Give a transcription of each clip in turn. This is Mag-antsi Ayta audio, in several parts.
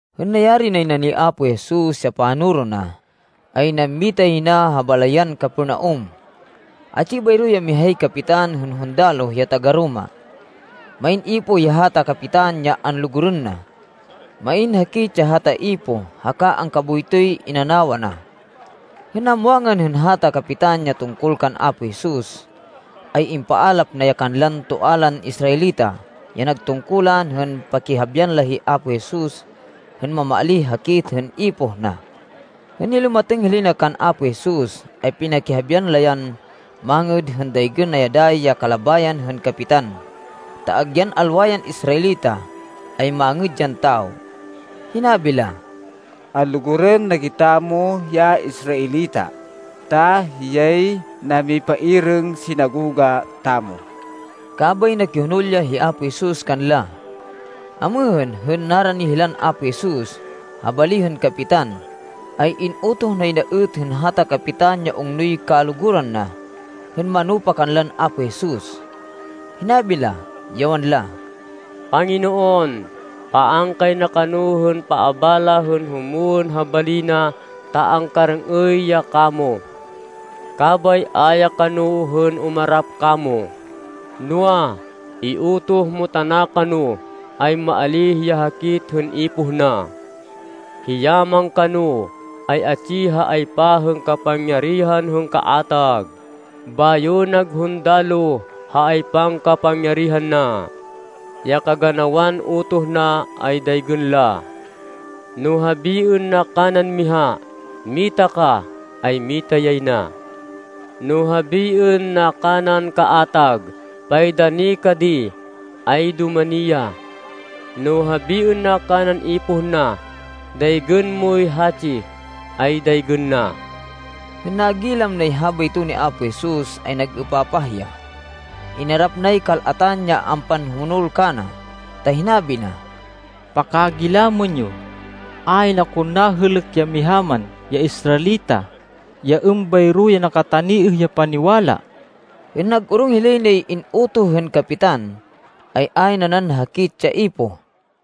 Hên nayari nay na ni Apo Jesus ya panoro na, ay nammita yay na ha balayan Capernaum. Atsi bayro ya mihay kapitan hên hundaloh ya taga-Roma. Main ipoh ya hata kapitan ya anlugurên na. Main hakit ya hata ipoh haka angkaboytoy inanawa na. Hên namwangan hên hata kapitan ya tungkol kan Apo Jesus, ay impaalap na ya kanlan toa lan Israelita ya nag tungkulan hên pakihabian la hi Apo Jesus hên mamaalíh hakit hên ipoh na. Hên nilumatêng hilay na kan Apo Jesus ay pinakihabian la yan mangêd hên daygên na dayi ya kalabayan hên kapitan, ta agyan alwa yan Israelita, ay mangêd yan tawo. Hinabi la, “Anlugurên na kitamo ya Israelita, ta hiyay namipairêng sinagoga tamo.” Kabay nakihonol ya hi Apo Jesus kanla. Amêhên, hên narani hilan Apo Jesus, ha bali hên kapitan, ay in-utoh nay na êt hên hata kapitan ya ungnoy kaluguran na hên manupa kanlan Apo Jesus. Hinabi la, ya wanla, “Panginoon, paan kay na kano hên paabala hên humwên ha bali na ta angkarêng-êy ya kamo. Kabay a ya kano hên umarap kamo, noa, iutoh mo tana kano, ay maalíh ya hakit hên ipoh na. Hiya man kano, ay atsi ha aypa hên kapangyarihan hên kaatag, bayo nag hundaloh ha aypan kapangyarihan na. Ya kaganawan utoh na ay daygên la. No habiên na kanan miha, ‘Mita ka,’ ay mita yay na. No habiên na kanan kaatag, ‘Paidani ka di,’ ay dumani ya. No habiên na kanan ipoh na, ‘Daygên moy hatsi,’ ay daygên na.” Hên nagilam nay habayto ni Apo Jesus ay nag-êpapah ya. Inarap nay kal-atan ya ampanhumonol kana ta hinabi na, “Pakagilamên yo, ayn akon nahêlêk ya miha man ya Israelita, ya êmbayro ya nakataniêh ya paniwala.” Hên nag-orong hilay nay in-utoh hên kapitan, ay ayn nanan hakit ya ipoh.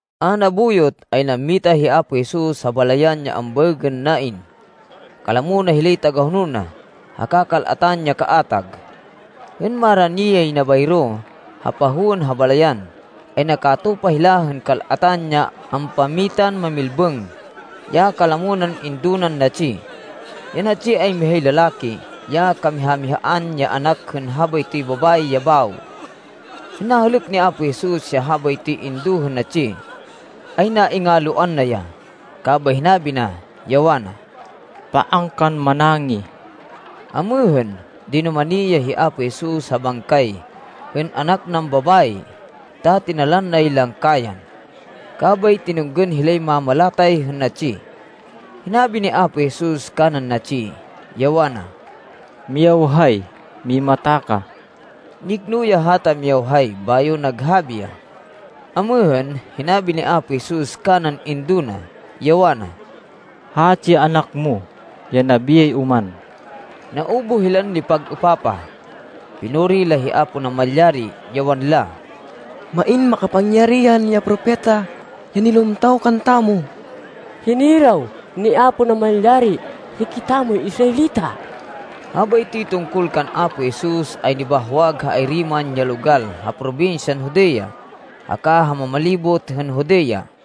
A nabuyot, ay nammita hi Apo Jesus ha balayan ya ambaêgên Nain. Kalamo na hilay tagahonol na, haka kal-atan ya kaatag. Hên marani yay na bayro ha pahowên ha balayan, ay nakatupa hila hên kal-atan ya ampammitan mamilbêng, ya kalamo nan indo nan natsi. Ya natsi ay mihay lalaki, ya kamiha-mihaan ya anak hên habaytoy babayi ya bawo. Hên nahêlêk ni Apo Jesus ya habaytoy indo hên natsi ay naingalwan na ya, kabay hinabi na, ya wana, “Paan kan manangih.” Amêhên, dinumani ya hi Apo Jesus ha bangkay hên anak nan babayi ta tinalan nay langkayan. Kabay tinunggên hilay mamalatay hên natsi. Hinabi ni Apo Jesus kanan natsi, ya wana, “Miyawhay, mimata ka.” Nikno ya hata miyawhay bayo naghabi ya. Amêhên, hinabi ni Apo Jesus kanan indo na, ya wana, “Hatsi ya anak mo, ya nabiyay oman.” Naubuh hilan nipag-êpapah. Pinuri la hi Apo Namalyari, ya wanla, “Main makapangyarihan ya propeta ya nilumtaw kantamo. Hiniraw ni Apo Namalyari hikitamoy Israelita.” Habaytoy tungkol kan Apo Jesus ay nibahwag ha ayri man ya logal ha probinsyan Judea haka ha mamalibot hên Judea.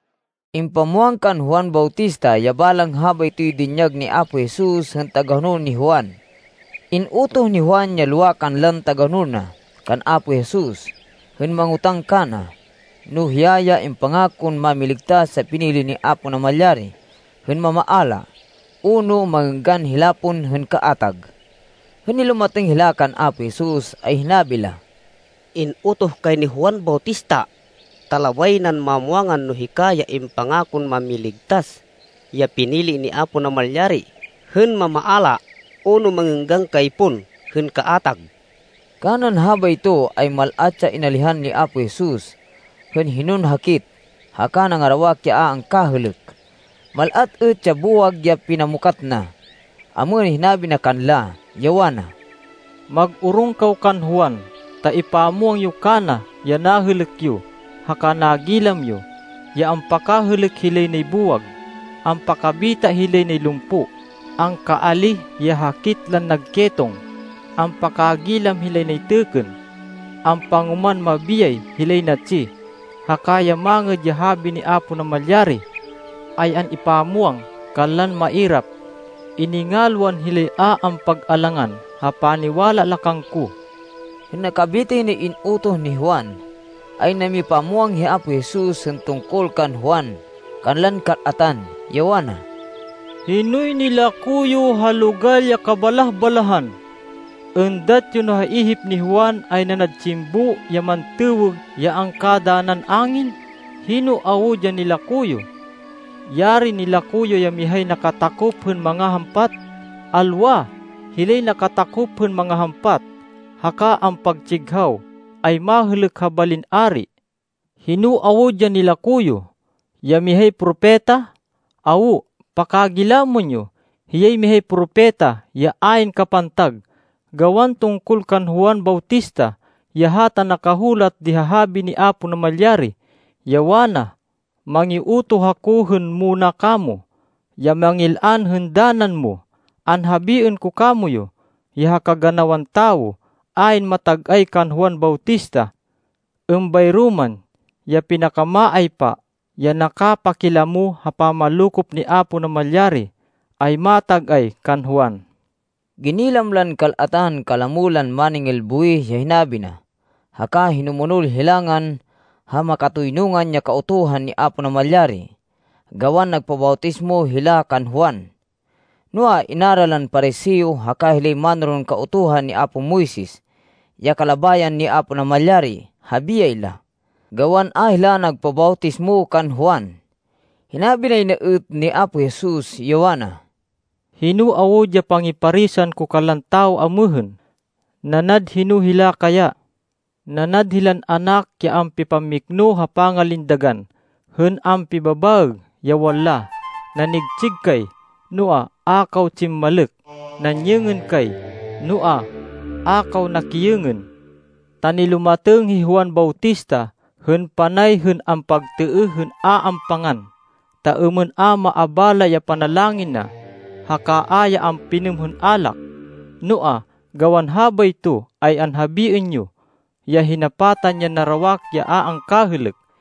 Impamwang kan Juan Bautista ya balang habaytoy dinyag ni Apo Jesus hên tagahonol ni Juan. In-utoh ni Juan ya lowa kanlan tagahonol na, kan Apo Jesus hên mangotáng kana, no hiya ya impangakon Mámiligtas ya pinili ni Apo Namalyari hên mamaala, o no mangênggan hila pon hên kaatag. Hên nilumatêng hila kan Apo Jesus, ay hinabi la, “In-utoh kay ni Juan Bautista, ta labay nan mamwangan no hika ya impangakon Mámiligtas ya pinili ni Apo Namalyari hên mamaala o no mangênggan kay pon hên kaatag.” Kanan habayto ay mal-at ya inalihan ni Apo Jesus hên hinon hakit, haka nangarawak ya a angkahêlêk. Mal-at êt ya buwag ya pinamukat na. Amêhên, hinabi na kanla, ya wana, “Mag-orong kaw kan Juan ta ipamwang yo kana ya nahêlêk yo haka nagilam yo, ya ampakahêlêk hilay nay buwag, ampakabita hilay nay lumpo, angkaalíh ya hakit lan nag ketong, ampakagilam hilay nay têkkên, ampangoman mabiyay hilay natsi, haka ya Mangêd ya Habi ni Apo Namalyari ay an-ipamwang kanlan mairap. Iningalwan hilay a ampag-alangan ha paniwala la kangko.” Hên nakabitay nay in-utoh ni Juan, ay namipamwang hi Apo Jesus hên tungkol kan Juan kanlan kal-atan, ya wana, “Hinoy nilako yo ha logal ya kabalah-balahan? Êndat yo no ya ihip ni Juan ay nanad tsimbo ya mantêwêg ya angkadanan angin? Hino awud ya nilako yo? Yarin nilako yo ya mihay nakatakop hên mangahampat! Alwa. Hilay nakatakop hên mangahampat, haka ampatsighaw, ay mahêlêk ha balin ari. Hino awud ya nilako yo? Ya mihay propeta? Awo. Pakagilamên yo! Hiyay mihay propeta ya ayn kapantag. Gawan tungkol kan Juan Bautista ya hata nakahulat di ha habi ni Apo Namalyari, ya wana, ‘Mangiutoh ako hên muna kamo, ya mangil-an hên danan mo.’ Anhabiên ko kamoyu, ya ha kaganawan tawo, ayn matag-ay kan Juan Bautista. Êmbayro man, ya pinakamaaypa ya nakapakilamo ha pamanlokop ni Apo Namalyari, ay matag-ay kan Juan.” Ginilam lan kal-atan kalamo lan máningil buwih ya hinabi na, haka hinumonol hilangan ha makatoynungan ya Kautuhan ni Apo Namalyari gawan nagpabawtismo hila kan Juan. Noa, in-ara lan Pariseo haka hilay mánoron Kautuhan ni apo Moises ya kalabayan ni Apo Namalyari ha biyay la, gawan a hila nagpabawtismo kan Juan. Hinabi nay na êt ni Apo Jesus, ya wana, “Hino awud ya pangiparisan ko kanlan tawo amêhên? Nanad hino hila kaya? Nanad hilan anak ya ampipammikno ha pangalindagan hên ampibabaêg, ya wanla, ‘Nanigtsig kay, noa, a kaw tsimmalêk. Nanyêngên kay, noa, a kaw nakiyêngên.’ Ta nilumatêng hi Juan Bautista hên panay hên ampagtêêh hên a ampangan ta êmên a maabala ya panalangin na, haka a ya ampinêm hên alak, noa gawan habayto ay anhabiên yo, ya hinapatan yan narawak ya a angkahêlêk.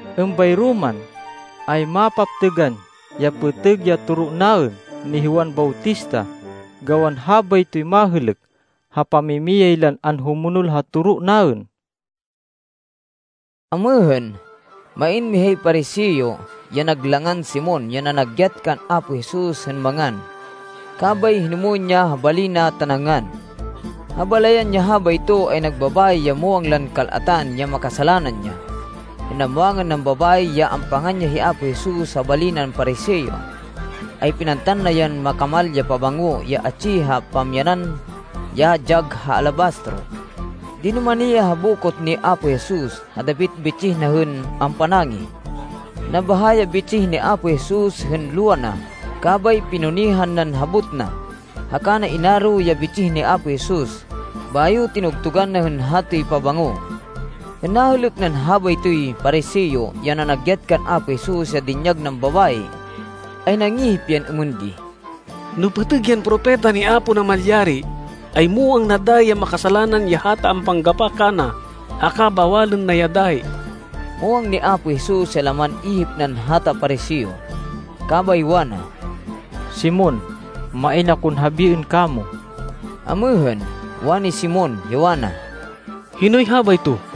Êmbayro man, ay mapaptêgan ya pêtêg ya toro naên ni Juan Bautista, gawan habaytoy mahêlêk ha pamimiyay lan anhumonol ha toro naên.” Amêhên, main mihay Pariseo ya nag langan Simon ya nanagyat kan Apo Jesus hên mangan. Kabay hinumwên ya ha bali na ta nangan. Ha balayan ya habayto, ay nag babayi ya muwang lan kal-atan ya makasalanan ya. Hên namwangan nan babayi ya ampangan ya hi Apo Jesus ha bali nan Pariseo, ay pinantan na yan makamal ya pabango ya atsi ha pamyanan ya dyag ha alabastro. Dinumani ya ha bokot ni Apo Jesus, ha dapit bitsih na hên ampanangih. Nabahá ya bitsih ni Apo Jesus hên luwa na kabay pinunihan nan habot na, haka na inaro ya bitsih ni Apo Jesus bayo tinugtugan na hên hatoy pabango. Hên nahêlêk nan habaytoy Pariseo ya nanagyat kan Apo Jesus ya dinyag nan babayi ay nangihip yan êmên di, “No pêtêg yan propeta ni Apo Namalyari, ay muwang na dayi ya makasalanan ya hata ampanggapa kana haka bawalên na ya dayi.” Muwang ni Apo Jesus ya laman ihip nan hata Pariseo, kabay wana, “Simon, main akon habiên kamo.” Amêhên, wani Simon, ya wana, “Hinoy habayto?”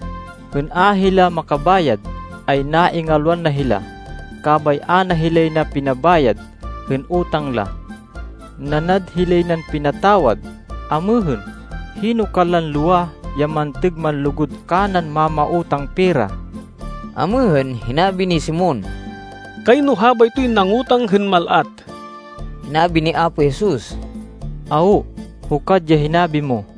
Hên a hila makabayad, ay naingalwan na hila, kabay a na hilay na pinabayad hên utang la. Nanad hilay nan pinatawad. Amêhên, hino kanlan lowa ya mantêg manlugud kanan mámautang pera?” Amêhên, hinabi ni Simon, “Kayno habaytoy nangútang hên mal-at.” Hinabi ni Apo Jesus, “Awo, hukad ya hinabi mo.”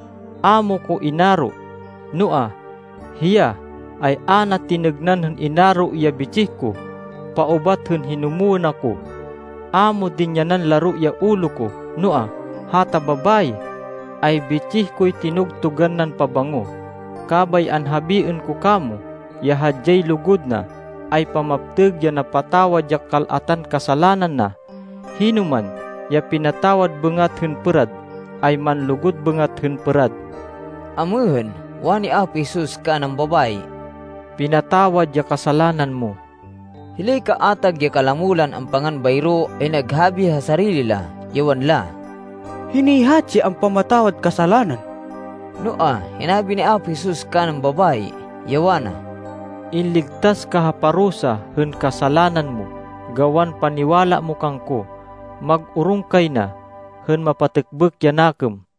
A mo ko inaro, noa, hiya, ay a na tinêgnan hên inaro ya bitsih ko paubat hên hinumwên ako. A mo dinyanan laro ya ulo ko, noa, hata babayi, ay bitsih koy tinugtugan nan pabango. Kabay anhabiên ko kamo ya hadyay lugud na ay pamaptêg ya napatawad ya kal-atan kasalanan na. Hinoman ya pinatawad bêngat hên pêrad ay manlugud bêngat hên pêrad.” Amêhên, wani Apo Jesus kanan babayi, “Pinatawad ya kasalanan mo.” Hilay kaatag ya kalamo lan ampangan bayro ay naghabi ha sarili la, ya wanla, “Hinoy hatsi ya ampamatawad kasalanan?” Noa, hinabi ni Apo Jesus kanan babayi, ya wana, “Inligtas ka ha parusa hên kasalanan mo gawan paniwala mo kangko. Mag-orong kay na, hên mapatêkbêk ya nakêm.”